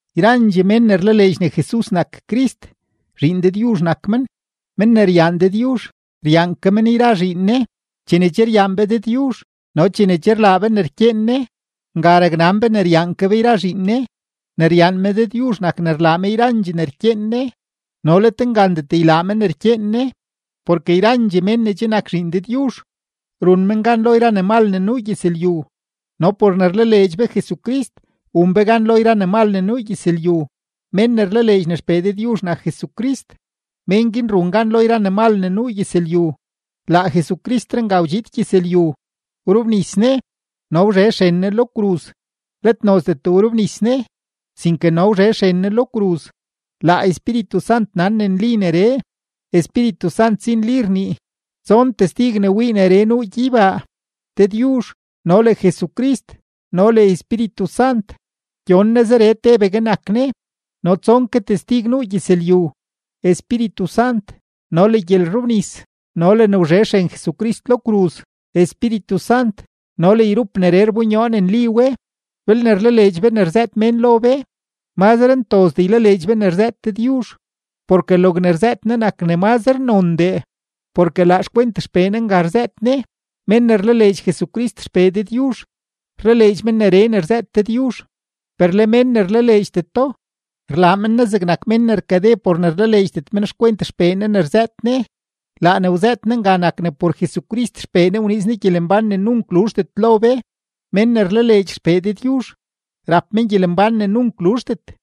Yrandxee mén ne rlaleedx ne Jesus nak Crist, zhiin Dëdyuzh nak men. Men ne ryaan Dëdyuzh, ryaan ke men yra zhiin Ne. Chene che ryaan be Dëdyuzh no chene che rlaa be ne rkyeen Ne, nga raknan be ne ryaan ke be yra zhiin Ne. Ne ryaan me Dëdyuzh nak ne rlaa me yrandxee ne rkyeen Ne. No let ngandet ylaa me ne rkyeen Ne. Porke yrandxee mén ne che nak zhiin Dëdyuzh, run men gan lo yra ne mal ne nuu gyëzlyu. No por ne rlaleedx be Jesucrist, wun be gan lo yra ne mal ne nuu gyëzlyu. Mén ne rlaleedx ne XPee Dëdyuzh nak Jesucrist, men guin run gan lo yra ne mal ne nuu gyëzlyu. Laa Jesucristree nga wdxiid gyëzlyu, wrobnis Ne no wzhe xren Ne lo kruz. Let nozdet wrobnis Ne, sinke no wzhe xren Ne lo kruz. Laa Espíritu Sant nan ne nli neree; Espíritu Sant si nli rnii. Tson testig ne wii neree nuu gyeybaa: Dëdyuzh no le Jesucrist no le Espíritu Sant; gyon Ne zeree tebegue nak Ne. No tson ke testig nuu gyëzlyu: Espíritu Sant no le gyelrobnis no le ne wzhe xren Jesucrist lo kruz; Espíritu Sant no le yrup neree rbonyoo ne nli we. Belne rlaleedx be ne rzëët mén lo be, mazre ntozdee ylaleedx be ne rzëët Dëdyuzh; porke logne rzëët Ne nak ne mazre nondee, porke laa xkwent XPee Ne nga rzëët Ne. Mén ne rlaleedx Jesucrist XPee Dëdyuzh, rlaleedx men neree ne rzëët Dëdyuzh, per le mén ne rlaleedxdeto, rlaa men Ne zegnak mén ne rkade por ne rlaleedxdet men xkwent XPee Ne ne rzëët Ne. Laa ne wzëët Ne nga nak ne por Jesucrist XPee Ne wniiz Ne gyelembán ne nunk luzhdet lo be. Mén ne rlaleedx XPee Dëdyuzh, rap men gyelembán ne nunk luzhdet;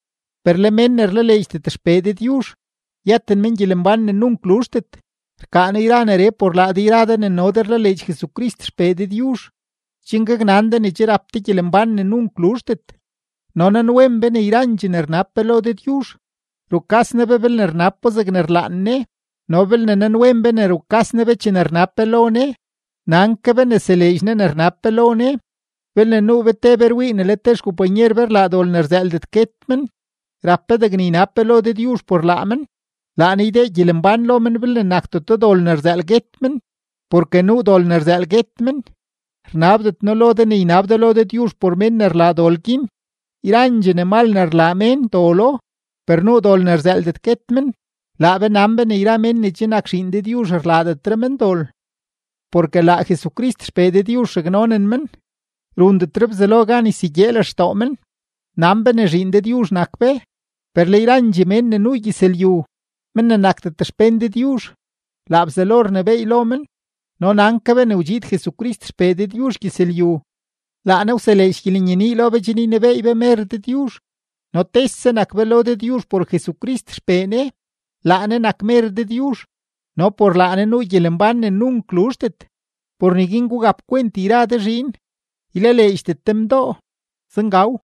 per le mén ne rlaleedxdet XPee Dëdyuzh, yëten men gyelembán ne nunk luzhdet. Rkaa noo yra neree por laa de yra de ne no de rlaleedx Jesucrist XPee Dëdyuzh, chen gaknan de ne che rap de gyelembán ne nunk luzhdet. No nanwen be ne yrandxee ne rnab be lo Dëdyuzh, rukas Ne be belne rnab bo zegne rlaan Ne. No belne nanwen be ne rukas Ne be chene rnab be lo Ne, nan ke be ne seleedx Ne ne rnab be lo Ne. Belne nuu be te be rwii ne le te xkompanyer be rlaa dol ne rzëëldet guet men, rap be degne ynab be lo Dëdyuzh por laa men; laa Ne ydee gyelembán lo men belne nakdeto dol ne rzëël guet men. Porke nuu dol ne rzëël guet men; rnabdet noo lo de ne ynab de lo Dëdyuzh por mén ne rlaa dol guin. Yrandxee ne mal ne rlaa mén dolo, per nuu dol ne rzëëldet guet men. Laa be nan be ne yra mén ne che nak zhiin Dëdyuzh rlaadetre men dol. Porke laa Jesucrist XPee Dëdyuzh raknonen men, rundetre Bzelo gan ysegyee lextoo men. Nan be ne zhiin Dëdyuzh nak be, per le yrandxee mén ne nuu gyëzlyu, men ne nakdet xpén Dëdyuzh, laa Bzelo rnebééy lo men. No nan ke be ne wdxiid Jesucrist XPee Dëdyuzh gyëzlyu, laa Ne wseleedx gyelenyenii lo be chen ynebeey be mer Dëdyuzh. No tese nak be lo Dëdyuzh por Jesucrist XPee Ne. Laa Ne nak mer Dëdyuzh no por laa Ne nuu gyelembán ne nunk luzhdet. Por neguin gugap kwent yra de zhiin, ylaleedxdet de mdoo. Zengaw.